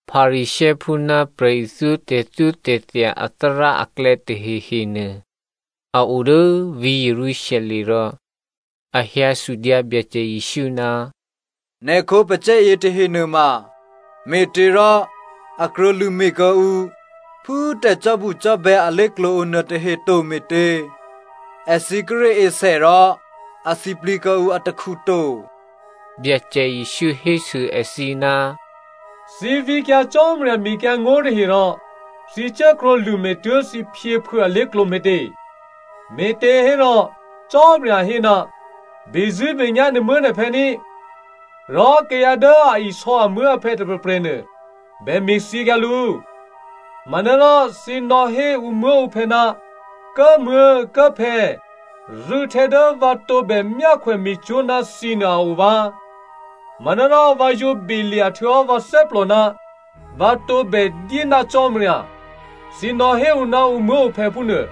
Pharisěophú ná prè̤ithyó tè̤thyótè̤thya athárá aklè̌ tahehenuô, a o dố vǐ̤ Jerusalem rò a hyǎ sudyǎ Byacè Jesǔ, “Nè̤ khǒpacè̤̌ yětahe nuôma me̤těrò a krwǒlṳ̂me̤ kuô̌ǔ phú tè̤cò́bucò́bè̌ alé̤klǒ o nuôtahe to me̤tě? Èthǐ kíré̤ esè rò a sǐplǐ kuô̌ǔ atakhu to.” Byacè Jesǔ hésû èthǐ, “Thǐ vǐkyǎ Cò́marya mekyǎngó̤ tahe rò thǐ cuốkrwǒ lṳ̂me̤ tuố̤ thǐ phyěphuô̌ alé̤klǒ me̤tě? Me̤těhérò, Cò́marya hé, ‘Bezṳ̂́benyá̤ nè̤muố̤nè̤phè̌ ní,’ rò ‘Kayǎ dố a isò̌ amuố̤aphè̌ tôprè̤prè̤nuô bè me̤thyěkyǎ lǔ.’ Manárò thǐ nò̌hé ǔmuố̤ǔphè̌, ‘Kố꤮ muố̤, Kố꤮ phè̌, rû̌htè̌ dố vǎ tǒbè myákhwè me̤cwó̤ ná thǐnuô a o vǎ, manárò vǎ yǒ belya̤ htuô̌hò́ vǎ thè́plò ná vǎ tǒbè dyé ná Cò́marya,’ thǐ nò̌hé ǔ ná ǔmuố̤ǔphè̌ phúnuô.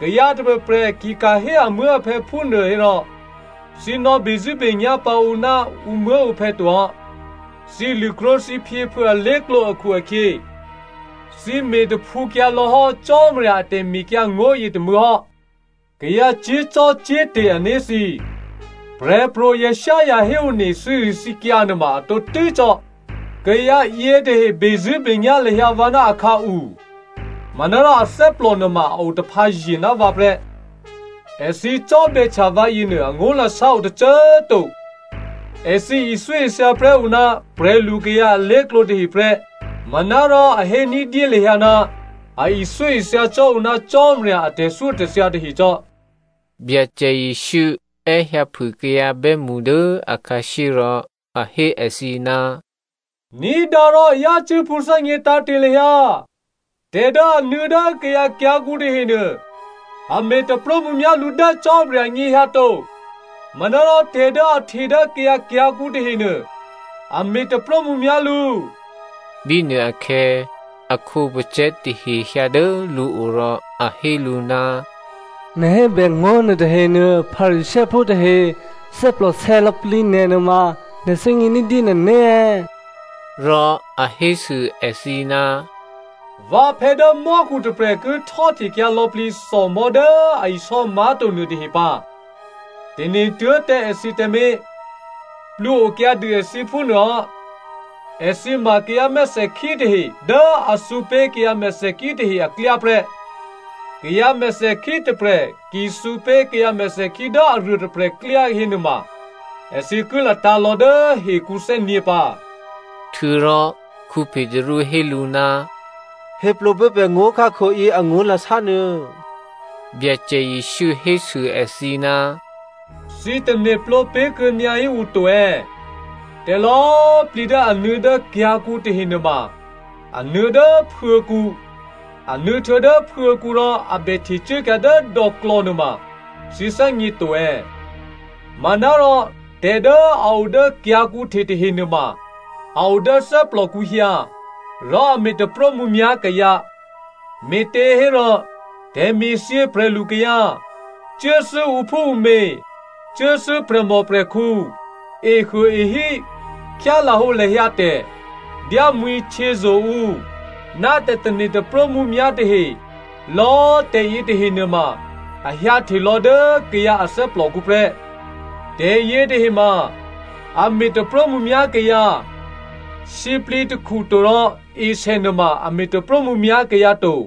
Kayǎ tôprè̤prè̤ ki ka̤ hé amuố̤aphè̌ phúnuô hérò thǐ nò̌bezṳ̂́benyá̤ pǎ ǔ ná ǔmuố̤ǔphè̌ to hò́. Thǐ lṳ̂krwǒ thǐ phyěphuô̌ alé̤klǒ akhu-akhyě thǐ me̤taphǔkyǎlò̌ hò́ Cò́marya a tè̤mekyǎngó̤ yětômû̌ hò́. Kayǎ cyé̤zò́cò́te̤ ané̤ thǐ꤮, Prè̤pro̤ Isaiah héone thǐrithǐkyǎ nuôma a tǒtû́ cò́. ‘Kayǎ yětahe bezṳ̂́benyá̤ lahyǎ vǎ ná akhǎu manárò athè́plò nuôma a otaphǎye̤ ná vǎ prè́. Èthǐ cò́bè̌htya vǎ yěnuô angó̤lasá o tôcô꤮ to. Èthǐ ithyóithya prè́ ǔ ná prè̤lukayǎ alé̤klǒ tahe prè́ manárò a hé ní̤dyé lahyǎ ná a ithyóithya cò́ ǔ ná Cò́marya a tè̤thyótè̤thya tahe cò́.’” Byacè Jesǔ è́hyǎphû kayǎ bè́mṳ dố akhǎshyé rò a hé èthǐ, “Ní̤dǎ rò yácû́ pṳ̌thè́gně tǎ̤te̤ lahyǎ. Tè̤ dố a nuô̌ dố kayǎ kyǎ̤kǔ tahenuô, a me̤ taprómǔmyá̤ lǔ dố Cò́marya anyěhyǎ to. Manárò tè̤ dố a hte dố kayǎ kyǎ̤kǔ tahenuô, a me̤ taprómǔmyá̤ lǔ.” Bínuôakhè̌ a khǒpacè̤̌ tahe hyǎ dố lǔo rò a hé lǔ, “Nè̤ hébè ngó̤ nuôtahenuô, Pharisěophú tahe thè́plòsè̌ lò̌plǐ nè̤ nuôma nè̤ thè́gně ní̤dyé nè̤né̤ è̌?” Rò a hésû èthǐ, “Vǎphè̌ dố mò́khu tôprè̤ ki htò́htekyǎ lò̌plǐ thòmò̤́ dố a isò́ má̤to nuôtahe pǎ. Tane̤ tuố̤ tǎ èthǐ tǎmé̤, plwǒ okyǎdû èthǐ phúnuô hò́. Èthǐ ma kayǎ mèthèkhí tahe dố a thǔpé̤ kayǎ mèthèkhí tahe aklyá prè́. Kayǎ mèthèkhí tôprè̤ ki thǔpé̤ kayǎ mèthèkhí dố aruôtôprè̤ klyá hénuôma èthǐ ki latǎ̤lò̌ dố hekǔ thè́nyě̤ pǎ.” Htuô̌rò Petru hé lǔ, “Héplǒ pé̤ pè̤ ngó̤khákho yě angó̤lasá nuô.” Byacè Jesǔ hésû èthǐ, “Thǐ tane̤plǒ pé̤ kuô̌nyǎhí ǔ to è̌? Tè̤lò̌꤮ plǐ dố a nuô̌ dố kyǎ̤kǔ tahe nuôma, a nuô̌ dố phuô̤̌kǔ, a nuô̌ htuô̌ dố phuô̤̌kǔ rò a bè htecuốkyǎ dố dò̌klò̌ nuôma thǐ thè́gně to è̌? Manárò tè̤ dố a o dố kyǎ̤kǔ hte tahe nuôma a o dố thè́plòkǔ hyǎ, rò a me̤ taprómǔmyá̤ kayǎ. Me̤těhérò tè̤me̤thyě prè̤lukayǎ, cuốthû́ ǔphúǔmě, cuốthû́ prè̤mòprè̤khǔ, ehuôehí, khyálahǒlahya tè̤, dyámwi̤htyězo̤ ǔ, ná tè̤tane̤ taprómǔmyá̤ tahe, lò̌꤮ tè̤ yětahe nuôma a hyǎhtelò̌ dố kayǎ a thè́plòkǔ prè́. Tè̤yě tahe ma a me̤ taprómǔmyá̤ kayǎ. Sǐplǐ takhu to rò esè nuôma a me̤ taprómǔmyá̤ kayǎ to.”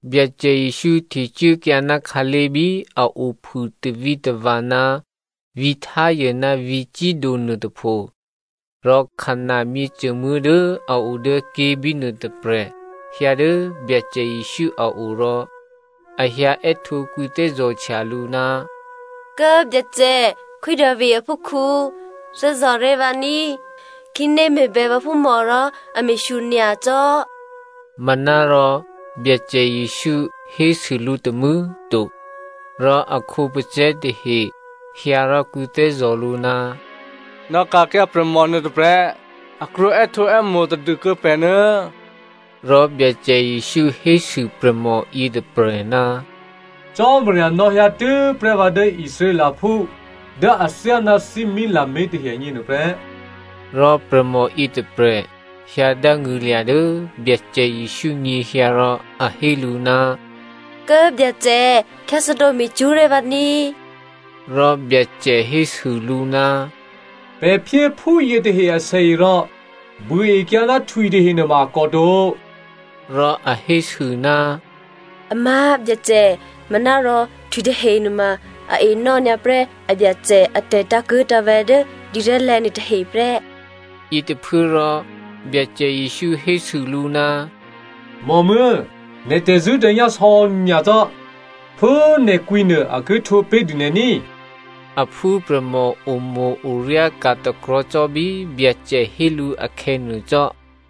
Byacè Jesǔ htecuốkyǎ ná khǎlé̤ bí a ophû tavǐtava̤ ná vǐ̤ Tyre ná vǐ̤ Sido nuôtôpho. Rò Canan myěcômuố̤ dố a o dố ké̤bínuô tôprè̤ hyǎ dố Byacè Jesǔ a o rò a hyǎ è́htǒ kwǐthè́zò̤htya lǔ, “Kố꤮ Byacè, Khwí Davi aphúkhǔ, thè́zò̤ré̤ vǎ ní꤮ khǐné me̤bè vǎphúmò rò a me̤shyo nyacò́.” Manárò Byacè Jesǔ hésû lǔ tômû̌꤮ to. Rò a khǒpacè̤̌ tahe hyǎ rò kwǐthè́zò̤ lǔ, “Nò̌ ka̤kyǎ prè̤mò nuô tôprè̤, a krwǒ è́htǒè́mo̤ tadû kuô̌ pè̤ nuô̌.” Rò Byacè Jesǔ hésû prè̤mò yětôprè̤, “Cò́marya nò̌hyǎ tû́prè́ vǎ dố Israelphú dố athyáná thímí lamé̤ tahe agně prè́.” Rò prè̤mò yětôprè̤ hyǎ dángṳ̂lya̤ dố Byacè Jesǔ nyěhyǎ rò a hé lǔ, “Kố꤮ Byacè, khyáthè́dǒ me̤cwó̤ ré̤ vǎ ní꤮.” Rò Byacè hésû lǔ, “Pè̤ phyé phú yětahe asèe rò buôekyǎ ná htwitahe nuôma a kòto.” Rò a hésû, “Amá̤, Byacè꤮ manárò htwitahe nuôma a enò́ nyǎprè́ abyacè atè̤ tǎ̤kuố̤tǎ̤vè̤̌ dố dǐrè̤́lè̤̌ nuôtahe prè́.” Yětôphuốrò Byacè Jesǔ hésû lǔ, “Mòmuố̤, nè̤ tè̤zṳ̂́tè̤nyá̤ sò̌nyacò́! Phú nè̤ kwǐ nuô a ki htwǒ pé̤dû nè̤ ní꤮.” A phúprè̤mò omo̤-oryá ka̤ takrò̤̌ cò́ bí Byacè hé lǔ akhè̌ nuô cò́.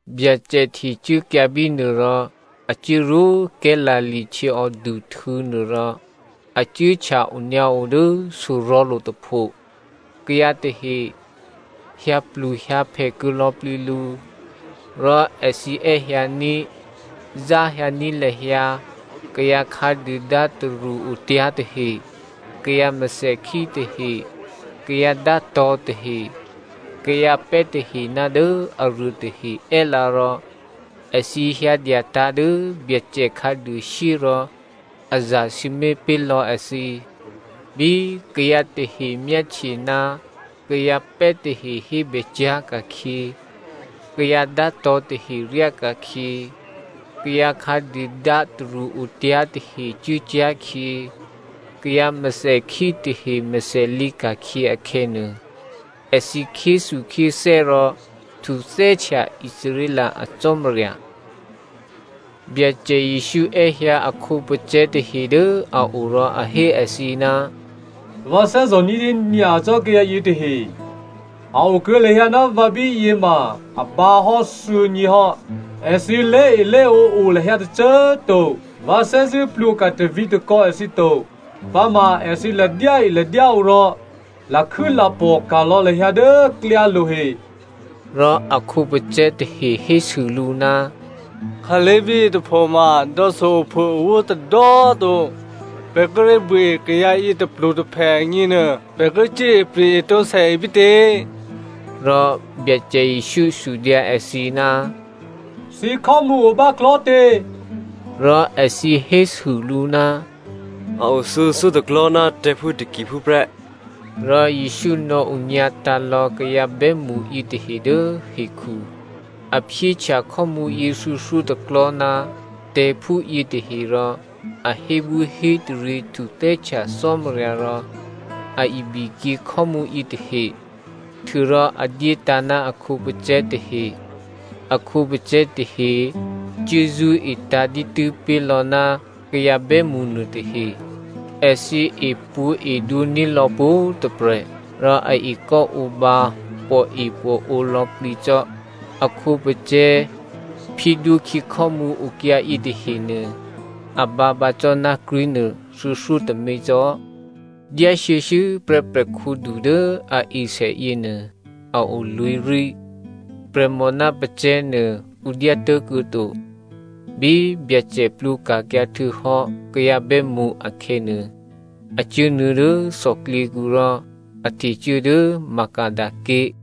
Byacè htecuốkyǎ bínuô rò a cuốrwó Galilea htyěòduhtû̌ nuô rò a cuốhtya onyǎo dố sorò̤̌lo̤ tôpho. Kayǎ tahe hyǎpluhyǎphè kuô̌ lò̌plǐ lǔ. Rò èthǐ è́hyǎní̤, záhyǎní̤ lahyǎ kayǎ khǎduôdá tarṳ́-otyá̤ tahe, kayǎ mèthèkhí tahe, kayǎ dátò̤̌ tahe, kayǎ pè́ tahe ná dố aruô tahe è́lǎ rò èthǐ hyǎdyatǎ̤ dố Byacè khǎduôshyé rò a zasǐmé̤ pé̤ lò̌ èthǐ. Bí kayǎ tahe myáhtye ná kayǎ pè́ tahe hébè cyá̤ ka̤khyě, kayǎ dátò̤̌ tahe ryáka̤khyě, kayǎ khǎduôdá tarṳ́-otyá̤ tahe cuốcyá̤khyě, kayǎ mèthèkhí tahe mèthè lǐka̤khyě akhè̌nuô, èthǐ khyéthukhyéthè́ rò htuthè́htya Israel a Cò́marya. Byacè Jesǔ è́hyǎ a khǒpacè̤̌ tahe dố a o rò a hé èthǐ, “Vǎ thè́zò̤ ní̤dyé nyacò́ kayǎ yětahe, a o kuô̌ lahyǎ ná vǎ bíyě ma a bǎ hò́ thuô̌nyě hò́. Èthǐ lé̤elé̤ǒ o lahyǎ tôcô꤮ to. Vǎ thè́zṳ̂́ plwǒka̤ tavǐ̤takò̌ èthǐ to, pǎma èthǐ ladyáeladyáǒ rò lakhû́lapò̤ ka̤lò̌ lahyǎ dố klyálo̤ he.” Rò a khǒpacè̤̌ tahe hésû lǔ, “Khǎlé̤ bíyě tôphoma dò̌so ophûowó tôdò̌꤮ to. Pè̤ kíré̤ buôe kayǎ yě tôplutôphè agněnuô, pè̤ ki cuốipri̤ etǒ sèe bítě?” Rò Byacè Jesǔ sudyǎ èthǐ, “Thǐkhò́mǔ o báklò̤́tě?” Rò èthǐ hésû lǔ, “A o thuô̌thyótôklò̤́ ná tè̤̌phú takiphú꤮ prè́.” Rò Jesǔ nò̌onyǎtǎ̤ lò̌ kayǎ bè́mṳ yětahe dố hekhu. A phyéhtya khò́mǔyě thuô̌thyótôklò̤́ ná tè̤̌phú yětahe rò a hébwíhétaryě htuthè́htya Cò́marya rò a ibikyě khò́mǔ yětahe, htuô̌rò a dyétǎ̤ ná a khǒpacè̤̌ tahe. A khǒpacè̤̌ tahe cuốzṳ́etǎ̤ dǐtû́ pé̤lò̌ ná kayǎ bè́mṳ nuôtahe. Èthǐ epwǒ̤edwǒ ní̤lò̌ pwǒ̤꤮ tôprè̤, rò a ekò́ǒbǎ pòepòǒ lò̌plǐ cò́. A khǒpacè̤̌ phyédwókhyě khò́mǔ okyǎ yětahenuô a bǎpǎ cò́ ná krí̤nuô thuô̌thyótômě cò́. Dyá shuô̌shuô̌prè́ prè̤khǔdu dố a esè yěnuô, a o lwǐ̤rí. Prè̤mò ná pacè̤̌ nuô ǔ dyá tố̤kuô̌ to. Bí Byacè plwǒka̤kyǎ htuô̌hò́ kayǎ bè́mṳ akhè̌nuô, a cuốnuô̌ dố thòklyěkǔ rò a htecuố dố Magada ké̤.